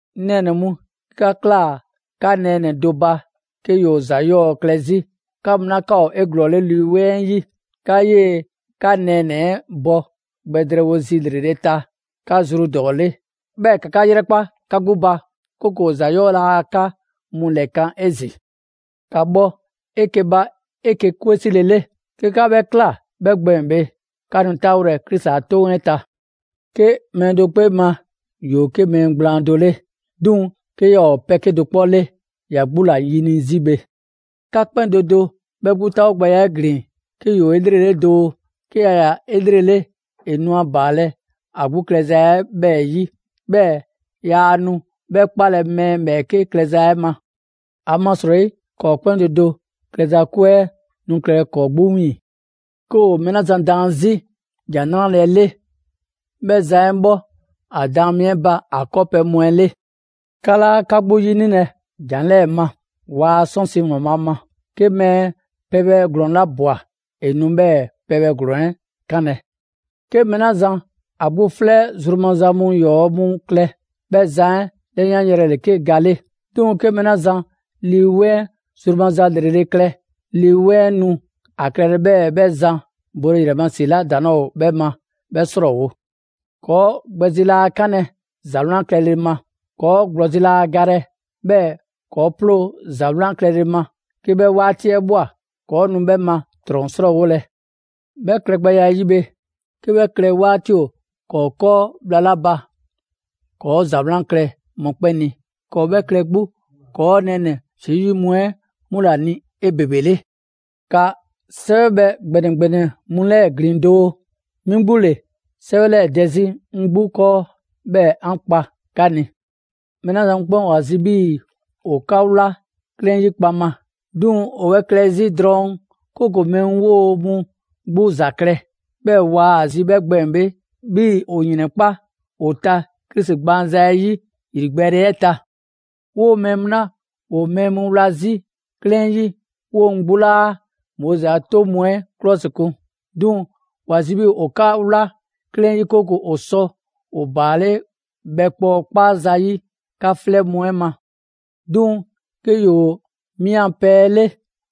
'Ŋ nɛɛnɛ‑ mu, 'ke 'ka ꞊klaa 'ka nɛɛnɛ‑ do ba 'ke ‑yoo ‑za 'yɔɔ‑ klɛ 'zi, 'ka mu 'la 'ka ‑o 'eglɔɔle Lii 'Weŋ 'ɛ 'yi, ‑ka 'yee‑ 'ka nɛɛnɛ‑ 'ɛ bɔ gbɛ drɛɛwo zi ‑lrele' 'ɛ ta 'ka zru ‑dɔɔ 'le. 'Bhɛɛ‑ ‑ka 'ka 'yrɛkpa 'ka 'gbu ba, 'kooko‑ ‑za 'yɔɔ‑ laa 'ka mu 'lɛkan‑ 'ezin‑. ‑Ka bhɔ 'eke‑ ba 'eke‑ 'kwe 'sile 'le. 'Ke 'ka 'bhɛ ꞊kla, 'bhɛ gbɛɛn‑ bhe, 'ka nu 'taawolɛ Krisi a 'toŋ 'ɛ ta. 'Ke mɛɛ do 'kpee ma ‑yoo 'ke mɛɛ gblaan do 'le, 'duŋ‑ 'ke yaa ‑o 'ke pɛ 'kedo‑ 'kpɔ 'le, ‑ya 'gbu ‑la ‑yini' 'zi bhe. 'Ka 'kpɛn do do 'bhɛ 'gbu 'taawogbɛya 'ɛ ‑glin 'ke ‑yoo 'elrele doo. 'Ke ‑ya ꞊ya 'elrele, ‑e nu ‑a ‑baalɛ' ‑a 'gbu klɛza 'ɛ 'bhɛɛ‑ 'yi, 'bhɛɛ‑ yaa nu 'bhɛ 'kpalɛ‑ mɛɛ ‑bhɛɛke' klɛza 'ɛ ma. ‑Amasrɔyi, ‑kɔɔ' 'kpɛn do do klɛza 'kwe 'ɛ nu klɛlɛ ‑kɔɔ' 'gbu 'wiiŋ‑. 'Ke ‑o mɛɛ 'la zan daan 'zi ‑Jan 'Nrale‑ 'ɛ 'le, 'bhɛ zan 'ɛ bhɔ ‑a daan mi 'ɛ ba ‑a 'kɔɔpɛ‑ mu 'ɛ 'le. 'Ka 'laa 'ka 'gbu 'yinilɛ ‑jan 'lɛɛ‑ ma: Waa 'sɔnsi‑ ‑Waanbhaa' ma. 'Ke mɛɛ pɛbhɛ ‑glɔɔn 'la ꞊bwa, ‑e nu 'bhɛɛ‑ pɛbhaa ‑glɔɔn 'ɛ 'kanlɛ‑. 'Ke mɛɛ 'la zan ‑a 'gbu 'flɛ zru maza mu ‑yɔɔ' mu klɛ, 'bhɛ zan 'ɛ 'lɛyanyrɛ ‑le 'ke ga 'le. 'Duŋ‑ 'ke mɛɛ 'la zan Lii 'Weŋ zru maza ‑lrele' klɛ, Lii 'Weŋ 'ɛ nu ‑a klɛlɛ 'bhɛɛ‑ 'bhɛ zan bole ‑yrɛ ma ‑si 'la ‑daŋ' 'laa ‑o 'bhɛ ma 'bhɛɛ‑ 'srɔɔwo‑. 'Kɔɔ‑ gbɛ zi laa 'kanlɛ‑ ‑za 'wlan klɛle ma. ‑Kɔɔ' ‑gblɔzi' laa galɛ 'bhɛɛ‑ ‑kɔɔ' ploo ‑za 'wlan klɛle ma, 'ke 'bhɛ 'waati 'ɛ ꞊bhwa, ‑kɔɔ' nu 'bhɛ ma ꞊trɔn 'srɔɔwolɛ. 'Bhɛ klɛgbɛya 'ɛ 'yi bhe, 'ke 'bhɛ klɛ 'waati ‑o ‑kɔɔ' 'kɔɔ bhla 'la ba, ‑kɔɔ' ‑za 'wlan klɛ mɔkpɛn' ni, ‑kɔɔ' 'bhɛ klɛ 'gbu ‑kɔɔ' nɛɛnɛ‑ Zesu 'yi mu 'ɛ 'mu ‑la ni 'ebebele. ‑Ka 'sɛwɛbhɛ ‑gbɛnɛ ‑gbɛnɛ mu 'lɛɛ‑ ‑glin doo, 'mi 'gbu ‑le 'sɛwɛ 'lɛɛ‑ dɛ 'zi 'ŋ 'gbu 'kɔɔ, 'bhɛɛ‑ 'an kpa 'ka ni. Mɛɛ 'la zan mu 'kpɛn ‑o ‑a zi' 'bhii‑ ‑o 'ka 'wla 'klɛɛn 'yi kpaŋma; 'duŋ‑ ‑o 'bhɛ klɛ 'zi drɔŋ 'kooko‑ mɛɛ mu 'woo‑ mu 'gbu ‑za klɛ. 'Bhɛɛ‑ waa‑ zi 'bhɛ gbɛɛn‑ bhe, 'bhii‑ ‑o ‑yrɛnkpa' ‑o ta Krisi gbaanza 'ɛ 'yi ‑yrigbɛɛle 'ɛ ta. 'Woo‑ mɛɛ mu 'la ‑woo mɛɛ mu 'wla 'zi 'klɛɛn 'yi, ‑woo mu 'gbu 'laa Moizi a 'toŋ mu 'ɛ 'klɔsikun. 'Duŋ‑ ‑wa zi 'bhii‑ ‑o 'ka 'wla 'klɛɛn 'ɛ 'yi, 'kooko‑ ‑o sɔ ‑o ‑baale' bhɛkpɔɔ 'kpaza‑ 'yi 'ka 'flɛ mu ma. 'Duŋ‑ 'ke ‑yoo 'mi 'an pɛ 'ɛ 'le,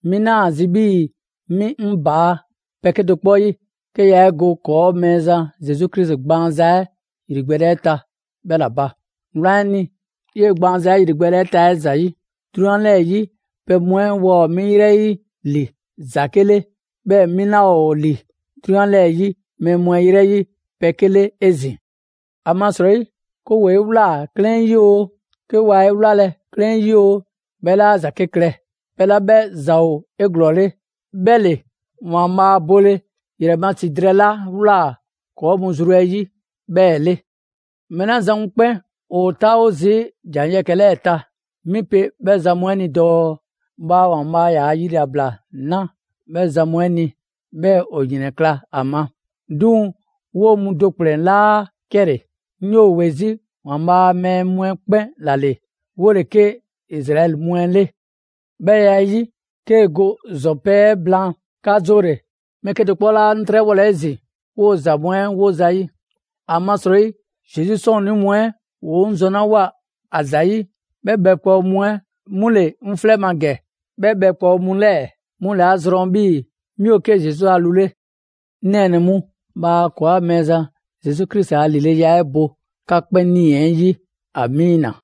'mi 'naa ‑a zi' 'bhii‑ 'mi 'ŋ ‑baa' pɛ 'kedo‑ 'kpɔ 'yi, 'ke yaa 'e go ‑kɔɔa' Mɛɛzan Zesu Krisi gbaanza 'ɛ ‑yrigbɛɛle 'ɛ ta 'bhɛ ‑la ba. Wlan 'ɛ ni, 'yee gbaanza 'ɛ ‑yrigbɛɛle 'ɛ ta 'ɛ ‑zayi', 'drunyan 'lɛɛ‑ 'yi pɛ mu 'ɛ waa ‑o 'mi 'yrɛ 'yi ‑li ‑zake' 'le, 'bhɛɛ‑ 'mi 'laa ‑o ‑li 'drunyan 'lɛɛ‑ 'yi mɛɛ mu 'ɛ 'yrɛ 'yi pɛ 'ke 'le 'ezin‑. ‑Amasrɔyi, 'ke ‑woo 'e ꞊wlaa 'klɛɛn 'yi oo, 'ke waa 'e wlalɛ 'klɛɛn 'yi oo, 'bhɛ 'laa ‑zake' klɛ. Pɛ 'la 'bhɛ ‑za ‑o 'eglɔɔle, 'bhɛ ‑le ‑Waanbhaa' bole ‑yrɛ ma ‑si drɛɛ 'la ꞊wlaa ‑kɔɔ' zru mu 'ɛ 'yi 'bhɛɛ‑ 'le. Mɛɛ 'la zan mu 'kpɛn ‑o 'taawo zii' ‑jan yɛkɛ‑ 'lɛɛ ‑ta, 'mi pe 'bhɛ zan mu 'ɛ ni dɔɔ: Bhaa ‑Waanbhaa' ‑yaa' yilabla 'na 'bhɛ zan mu 'ɛ ni, 'bhɛɛ‑ ‑o ‑yrɛnkla' ‑a ma. 'Duŋ‑ 'woo‑ mu do ‑kplɛn 'laa 'kɛle‑, 'ŋ 'yoo‑ ‑we 'zi ‑Waanbhaa' a mɛɛ mu 'ɛ 'kpɛn ‑la ‑le, 'wo ‑le 'ke Izraɛli mu 'ɛ 'le. 'Bhɛ ya 'ɛ 'yi, 'kee‑ go ‑zɔn pɛ 'ɛ blaan, 'ka 'zoole‑, mɛɛ 'kedo‑ 'kpɔ 'laa 'ŋ 'trɛbhɔlɛ 'ezin‑ 'woo‑ ‑za mu 'ɛ ‑o ‑zayi'. ‑Amasrɔyi, Zesu 'sɔɔnnii mu 'ɛ ‑woo 'ŋ zɔnlawoa ‑a ‑zayi', 'bhɛ bhɛkpɔɔ mu 'ɛ 'mu ‑le 'ŋ 'flɛ ma ‑gɛ. 'Bhɛ bhɛkpɔɔ mu 'lɛɛ‑ 'mu ‑le 'a zrɔn 'bhii‑ 'mi ‑o 'ke Zesu ‑a lu 'le. 'Ŋ nɛɛnɛ‑ mu, bhaa ‑kɔɔa' Mɛɛzan Zesu Krisi a ‑lileya 'ɛ bo 'ka 'kpɛn 'nii‑ 'ɛ 'yi! Amiina.